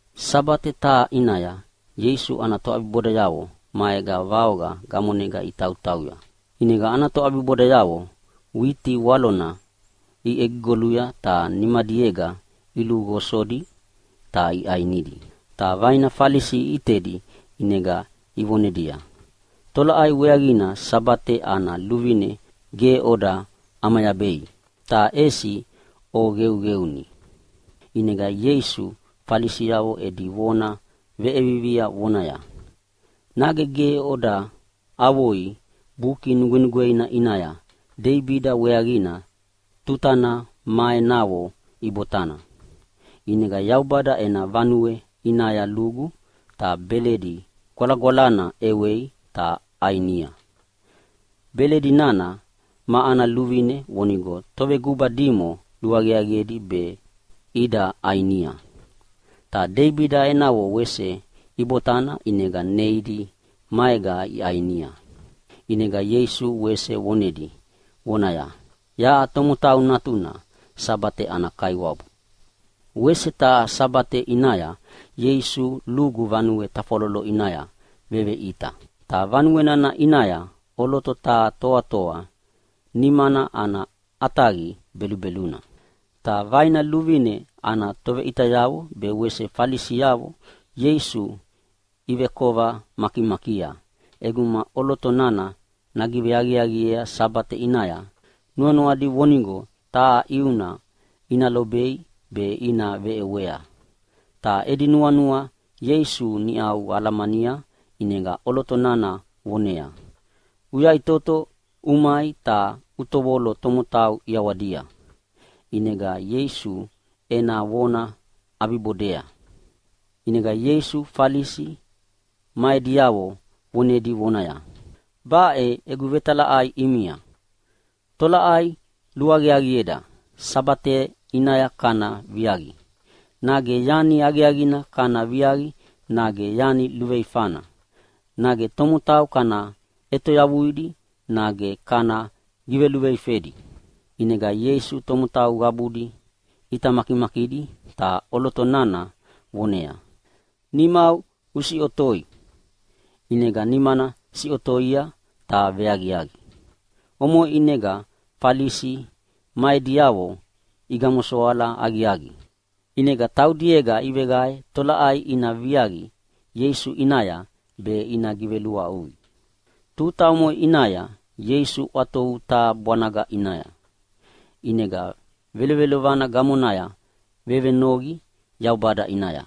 Sabate taha ʼinaya Ieisu ana toʼabibodayavo maega vaoqa gamonega itautauya. ʼInega ana toʼabibodayavo witi walona iʼegigoluya ta nimadiega iluqosodi ta iʼainidi. Ta vaina Falisi iʼitedi ʼinega ivonedia, “Tolaʼai weaqina Sabate ana luvine ge oda ʼamayabei ta ʼesi oqeuqeuni?” ʼInega Ieisu Falisiavo edi vona veʼiea vonaya, “Nage ge oda avoi Buki Nugwenugweina ʼinaya Deibida weaqina tutana ma enavo ibotana? ʼInega Yaubada ena vanue ʼinaya lugu ta beledi gwalagwalana ʼewei ta ʼainia. Beledi nana ma ana luvine vonigo toveguba dimo luaqiaqiedi be ida ʼainia. Ta Deibida enavo wese ibotana ʼinega neidi maega iʼainia.” ʼInega Ieisu wese vonedi vonaya, “Yaʼa Tomotau Natuna Sabate ana Kaiwabu!” Wese taha Sabate ʼinaya Ieisu lugu vanue tafwalolo ʼinaya veveʼita. Ta vanue nana ʼinaya ʼoloto taha toatoa nimana ana ʼataqi belubeluna. Ta vaina luvine ana toveʼitayavo be wese Falisiavo Ieisu ivekova makimakia ʼeguma ʼoloto nana nagiveaqiaqiea Sabate ʼinaya. Nuanuadi vonigo taha ʼiuna ina lobei be ina veʼewea. Ta edi nuanua Ieisu niʼau alamania ʼinega ʼoloto nana voneaya, “Uyaʼitoto umai ta utovolo tomotau ʼiawadia!” ʼInega Ieisu ena vona ʼabibodea. ʼInega Ieisu Falisi ma ediavo vonedi vonaya, “Baʼe egu vetalaʼai ʼimia, tolaʼai luaqiaqieda Sabate ʼinaya kana viaqi, nage yani aqiaqina kana viaqi, nage yani luveifana, nage tomotau kana ʼetoyavuidi nage kana giveluveifedi?” ʼInega Ieisu tomotau qabudi ʼita makimakidi ta ʼoloto nana voneaya, “Nimau usiʼotoi!” ʼInega nimana siʼotoia ta veaqiaqi. Omoʼe ʼinega Falisi ma ediavo igamosoala aqiaqi, ʼinega taudiega iveqae tolaʼai ina viaqi Ieisu ʼinaya be ina giveluaʼui. Tuta omoʼe ʼinaya Ieisu ʼwatovu taha bwanaga ʼinaya. ʼInega velovelovana gamonaya vevenoqi Yaubada ʼinaya.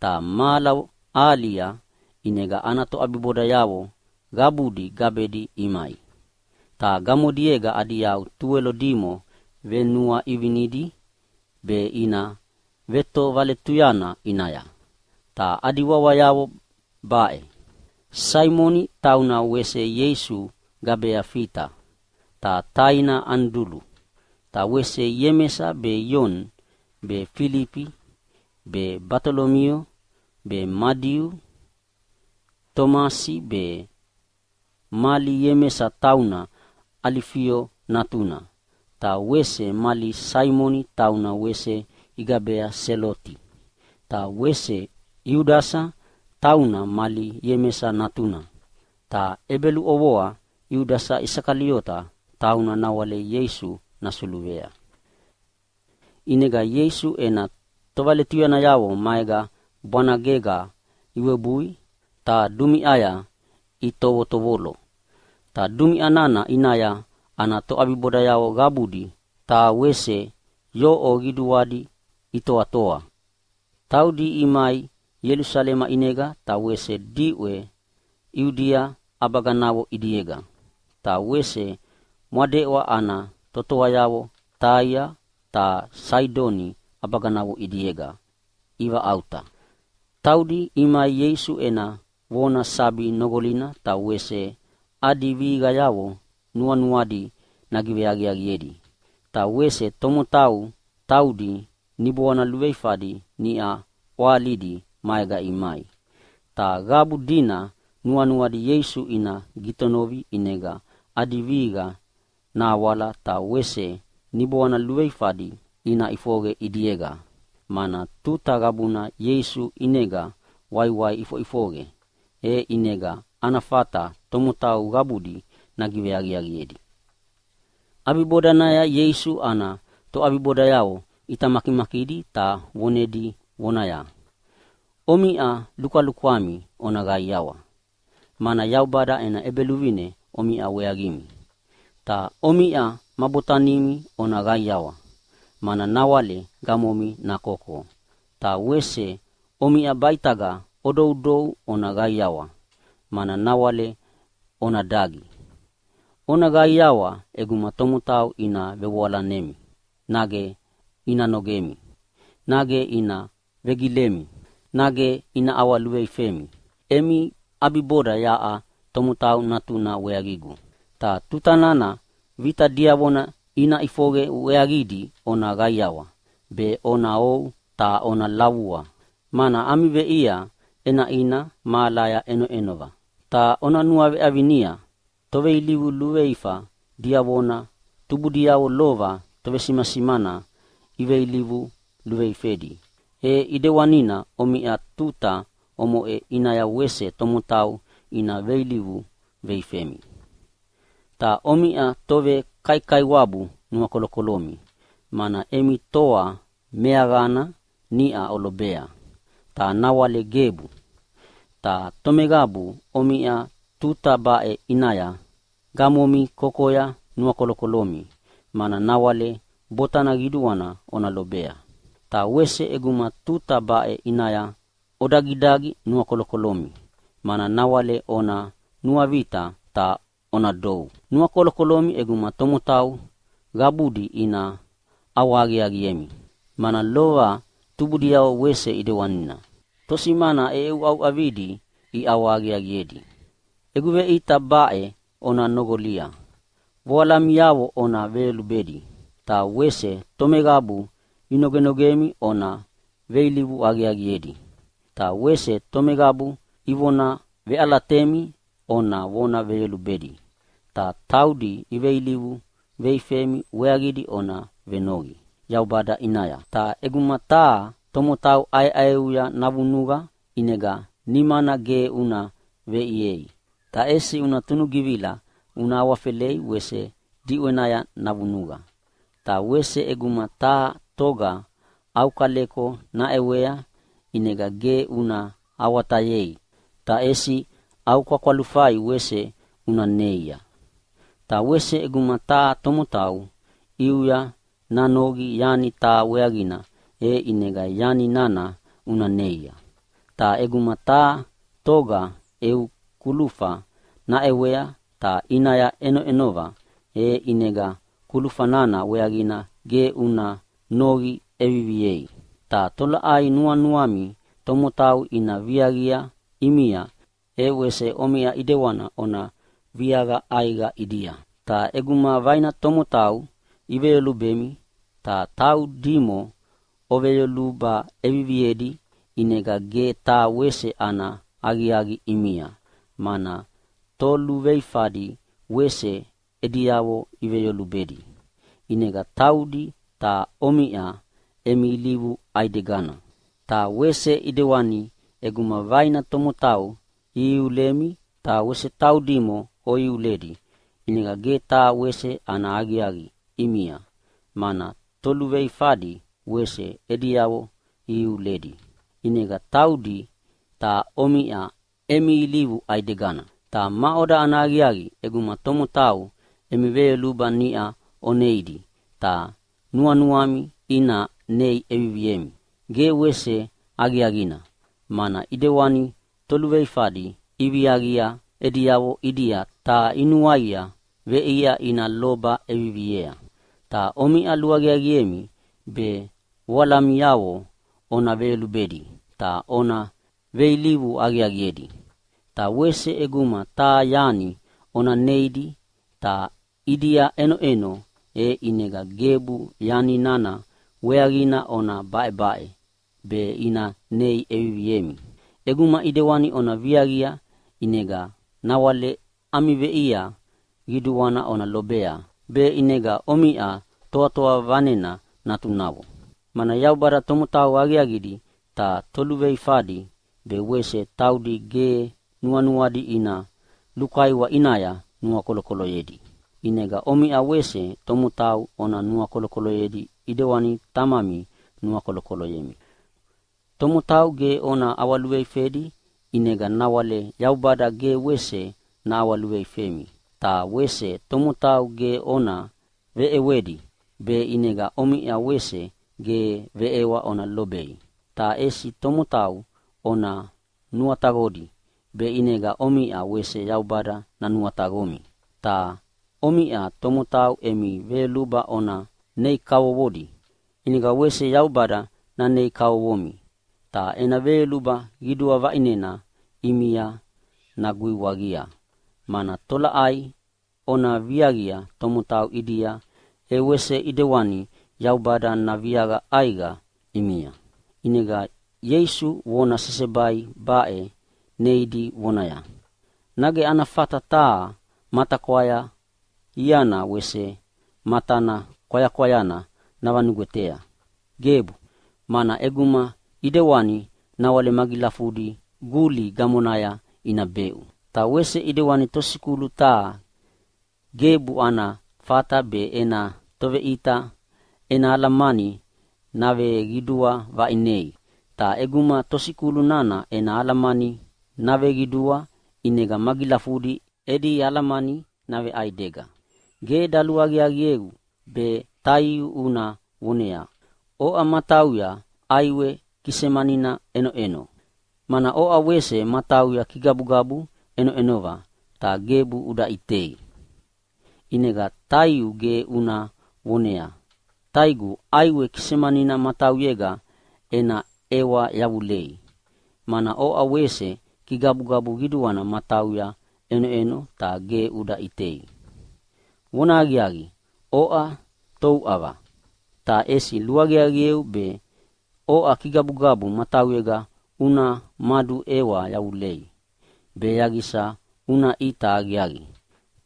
Ta mahala ahalia ʼinega ana toʼabibodayavo qabudi gabedi imai. Ta gamodiega adi yau tuwelo dimo venuaʼivinedi be ina vetovaletuyana ʼinaya, ta adi wawayavo baʼe: Saimoni (tauna wese Ieisu gabea Fita), ta taina Anidulu. Ta wese Iemesa be, Ioni be, Filifi be, Batolomio be, Madiu be, Tomasi be, mali Iemesa tauna Alifio natuna, ta wese mali Saimoni tauna wese igabea Seloti, ta wese Iudasa (tauna mali Iemesa natuna), ta ʼebeluʼovoa Iudasa Isakaliota, tauna nawale Ieisu nasuluvea. ʼInega Ieisu ena tovaletuyanayavo maega bwanagega iwebui ta dumiʼaya itovotovolo. Ta dumiʼa nana ʼinaya ana toʼabibodayavo qabudi ta wese yoʼo qiduadi itoatoa. Taudi imai Ielusalema ʼinega, ta wese diʼwe Iudia ʼabaganavo ʼidiega. Ta wese mwadeʼwa ana totoayavo Taia ta Saidoni ʼabaganavo ʼidiega ivaʼauta. Taudi imai Ieisu ena vona sabi noqolina, ta wese adi vihiqayavo nuanuadi nagiveaqiaqiedi. Ta wese tomotau taudi niboana luveifadi niʼa ʼwahalidi maega imai. Ta qabu dina nuanuadi Ieisu ina gitonovi ʼinega adi vihiqa nahawala ta wese niboana luveifadi ina ʼifoqe ʼidiega, mana tuta qabuna Ieisu ʼinega waiwai ʼifoʼifoqe, e ʼinega ana fata tomotau qabudi nagiveaqiaqiedi. ʼAbibodanaya Ieisu ana toʼabibodayavo ʼita makimakidi ta vonedi vonaya, “Omiʼa lukwalukwami ona qaiawa, mana Yaubada ena ʼEbeluvine omiʼa weaqimi. Ta omiʼa ma botanimi ona qaiawa, mana nawale gamomi nakoko. Ta wese omiʼa baʼitagana odoudou ona qaiawa, mana nawale ona dagi. Ona qaiawa ʼeguma tomotau ina vevoalanemi nage ina nogemi nage ina vegilemi nage ina ʼawaluveifemi emi ʼabiboda yaʼa Tomotau Natuna weaqigu. “Ta tuta nana vita diavona ina ʼifoqe weaqidi ona qaiawa be ona ou ta ona lavua, mana ami veʼia ʼenaʼina mahalaya ʼenoʼenova. Ta ona nuaveʼavinia toveilivu luveifa diavona tubudiavo lova tovesimasimana iveilivu luveifedi, e ʼedewanina omiʼa tuta omoʼe ʼinaya wese tomotau ina veilivu veifemi. “Ta omiʼa tovekaikaiwabu nuakolokolomi, mana emi toa meaqana niʼau olobea, ta nawale gebu. Ta tomeqabu omiʼa tuta baʼe ʼinaya gamomi kokoya nuakolokolomi, mana nawale botana qiduana ona lobea. Ta wese ʼeguma tuta baʼe ʼinaya odagidagi nuakolokolomi, mana nawale ona nuavita ta ona dou. Nuakolokolomi ʼeguma tomotau qabudi ina ʼawahaqiaqiemi, mana lova tubudiavo wese ʼedewanina tosimana ʼeʼeuʼauʼavidi iʼawahaqiaqiedi. “Egu veʼita baʼe ona noqolia: Voalamiavo ona veyolubedi, ta wese tomeqabu inogenogemi ona veilivu aqiaqiedi. Ta wese tomeqabu ivona veʼalatemi ona vona veyolubedi, ta taudi iveilivu veifemi weaqidi ona venoqi Yaubada ʼinaya. Ta ʼeguma taha tomotau ʼaeʼaeuya navunuqa ʼinega nimana ge una veʼiei, ta ʼesi una tunugivila una awafelei wese diʼwenaya navunuqa. Ta wese ʼeguma taha toga au kaleko naʼewea, ʼinega ge una awatayei ta ʼesi au kwakwalufai wese una neia. Ta wese ʼeguma taha tomotau ʼiuya nanoqi yani taha weaqina, e ʼinega yani nana una neia. Ta ʼeguma taha toga eu kulufa naʼewea ta ʼinaya ʼenoʼenova, e ʼinega kulufa nana weaqina ge una noqi ʼeviviei. Ta tolaʼai nuanuami tomotau ina viaqia ʼimia, e wese omiʼa ʼidewana ona viaqa ʼaiqa ʼidia. “Ta ʼeguma vaina tomotau iveyolubemi ta taudimo oveyoluba ʼeviviedi ʼinega ge taha wese ana aqiaqi ʼimia, mana toluveifadi wese ediavo iveyolubedi, ʼinega taudi ta omiʼa emi ilivu ʼaidegana. Ta wese ʼedewani ʼeguma vaina tomotau ihiulemi ta wese taudimo oiuledi, ʼinega ge taha wese ana aqiaqi ʼimia, mana toluveifadi wese ediavo ihiuledi. ʼInega taudi ta omiʼa emi ilivu ʼaidegana. Ta maʼoda ana aqiaqi ʼeguma tomotau emi veyoluba niʼa oneidi ta nuanuami ina nei ʼeviviemi? Ge wese aqiaqina, mana ʼidewani toluveifadi iviaqia ediavo ʼidia ta inuaia veʼia ina loba ʼeviviea. “Ta omiʼa luaqiaqiemi be voalamiavo ona veyolubedi ta ona veilivu aqiaqiedi. Ta wese ʼeguma taha yani ona neidi ta ʼidia ʼenoʼeno, e ʼinega gebu yani nana weaqina ona baʼebaʼe be ina nei ʼeviviemi. ʼEguma ʼidewani ona viaqia e ʼinega nawale ami veʼia qiduana ona lobea, be ʼinega omiʼa Toatoa Vanena natunavo. Mana Yaubada tomotau aqiaqidi ta toluveifadi be wese taudi ge nuanuadi ina lukaiwa ʼinaya nuakolokoloyedi. “ʼInega omiʼa wese tomotau ona nuakolokoloyedi ʼidewani Tamami nuakolokoloyemi. “Tomotau ge ona ʼawaluveifedi, ʼinega nawale Yaubada ge wese naʼawaluveifemi. Ta wese tomotau gebu ona veʼewedi, be ʼinega omiʼa wese ge veʼewa ona lobei. Ta ʼesi tomotau ona nuataqodi be ʼinega omiʼa wese Yaubada nanuataqomi. Ta omiʼa tomotau emi veyoluba ona nei kavovodi, ʼinega wese Yaubada nanei kavovomi ta ena veyoluba qidua vaʼinena ʼimia naguiwaqia, mana tolaʼai ona viaqia tomotau ʼidia, e wese ʼedewani Yaubada naviaqa ʼaiqa ʼimia.” ʼInega Ieisu vona sesebai baʼe neidi vonaya, “Nage ana fata taha matakwaya iana wese matana kwayakwayana navanugwetea? Gebu! Mana ʼeguma ʼedewanina, nawale magilafudina guli gamonaya ina beʼu. Ta wese ʼedewani tosikulu taha gebu ana fata be ena toveʼita ena alamani naveqidua vaʼinei. Ta ʼeguma tosikulu nana ena alamani naveqidua ʼinega magilafudi edi alamani naveʼaidega. “Ge daluaqiaqieu be taiu una voneaya, ‘Oʼa matauya ʼaiwe kisemanina ʼenoʼeno’, mana oʼa wese matauya kigabugabu ʼenoʼenova ta ge uda ʼitei? ʼInega taiu ge una voneaya, ‘Taigu, ʼaiwe kisemanina matauyega ena ʼewa yavulea’, mana oʼa wese kigabugabu qiduana matauya ʼenoʼenova ta ge uda ʼitei. Vonahaqiaqi, oʼa touʼava! Ta ʼesi luaqiaqieu be oʼa kigabugabu matauyega una maduʼewa yavulei be yaqisa una ʼita aqiaqi,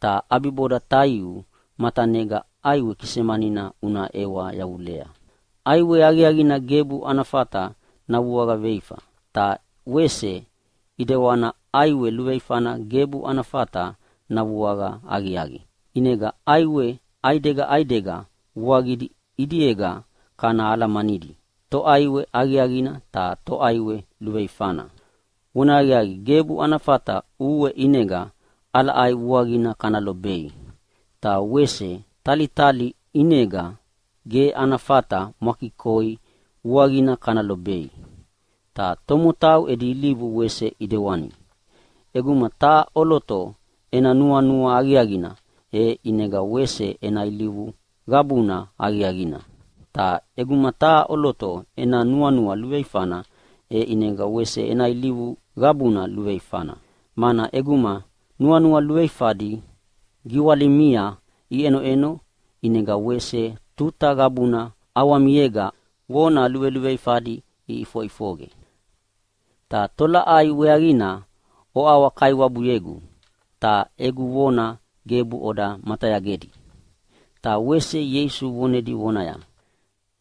ta ʼabiboda taiu matanega ʼaiwe kisemanina una ʼewa yavulea. “ʼAiwe aqiaqina gebu ana fata navuaqa veifa. Ta wese ʼedewana ʼaiwe luveifana gebu ana fata navuaqa aqiaqi. ʼInega ʼaiwe ʼaidega ʼaidega vuaqidi ʼidiega kana alamanidi toʼaiwe aqiaqina ta toʼaiwe luveifana. Vonahaqiaqi, gebu ana fata ʼue ʼinega ʼalaʼai vuaqina kana lobei, ta wese talitali ʼinega ge ana fata mwakikoi vuaqina kana lobei. Ta tomotau edi ilivu wese ʼedewani. ʼEguma taha ʼoloto ena nuanua aqiaqina, e ʼinega wese ena ilivu qabuna aqiaqina. Ta ʼeguma taha ʼoloto ena nuanua luveifana, e ʼinega wese ena ilivu qabuna luveifana. Mana ʼeguma nuanua luveifadi giwalimia iʼenoʼeno ʼinega wese tuta qabuna ʼawamiega vona luveluveifadi iʼifoʼifoqe. “Ta tolaʼai weaqina oʼawa-Kaiwabuyegu, ta egu vona gebu oda matayagedi?” Ta wese Ieisu vonedi vonaya,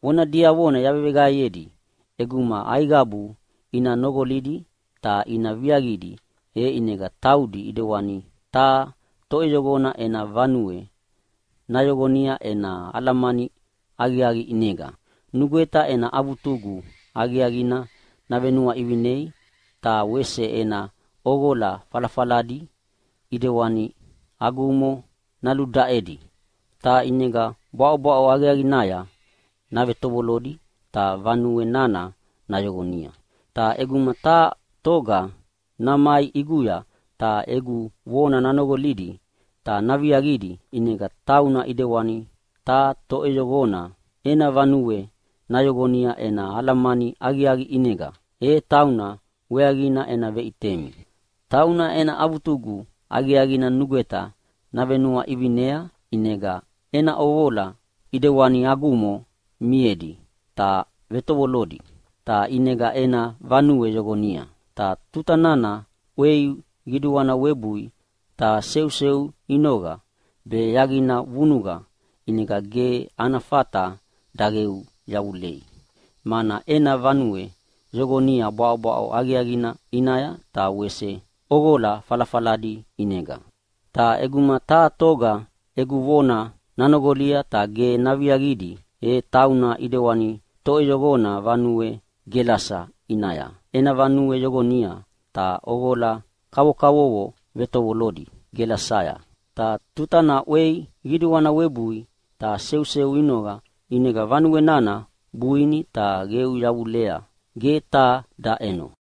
“Vona diavona yaveveqaeyedi ʼeguma aiqabu ina noqolidi ta ina viaqidi, e ʼinega taudi ʼidewana taha toʼeyoqona ena vanue nayoqonia ena alamani aqiaqi ʼinega. Nugweta ena avutugu aqiaqina navenuaʼivinia ta wese ena ʼoqola falafaladi ʼidewana agumo naludaʼedi. Ta ʼinega bwaʼobwaʼo aqiaqinaya navetovolodi ta vanue nana nayoqonia. Ta ʼeguma taha toga namai ʼiguya ta egu vona nanoqolidi ta naviaqidi, ʼinega tauna ʼedewani taha toʼeyoqona ena vanue nayoqonia ena alamani aqiaqi ʼinega. E tauna weaqina ena veʼitemi. Tauna ena avutugu aqiaqina nugweta navenuaʼivinia, ʼinega ena ʼoqola ʼidewani agumo miedi ta vetovolodi, ta ʼinega ena vanue yoqonia. Ta tuta nana ʼwei qiduana webui ta seuseu inoqa be yaqina vunuqa ʼinega ge ana fata daqeu yavulei, mana ena vanue yoqonia bwaʼobwaʼo aqiaqina ʼinaya ta wese ʼoqola falafaladi ʼinega. “Ta ʼeguma taha toga egu vona nanoqolia ta ge naviaqidi, e tauna ʼedewani toʼeyoqona vanue gelasa ʼinaya ena vanue yoqonia ta ʼoqola kavokavovo vetovolodi gelasaya. Ta tutana ʼwei qiduana webui ta seuseu inoqa, ʼinega vanue nana buini ta qeu yavulea ge taha daʼeno.”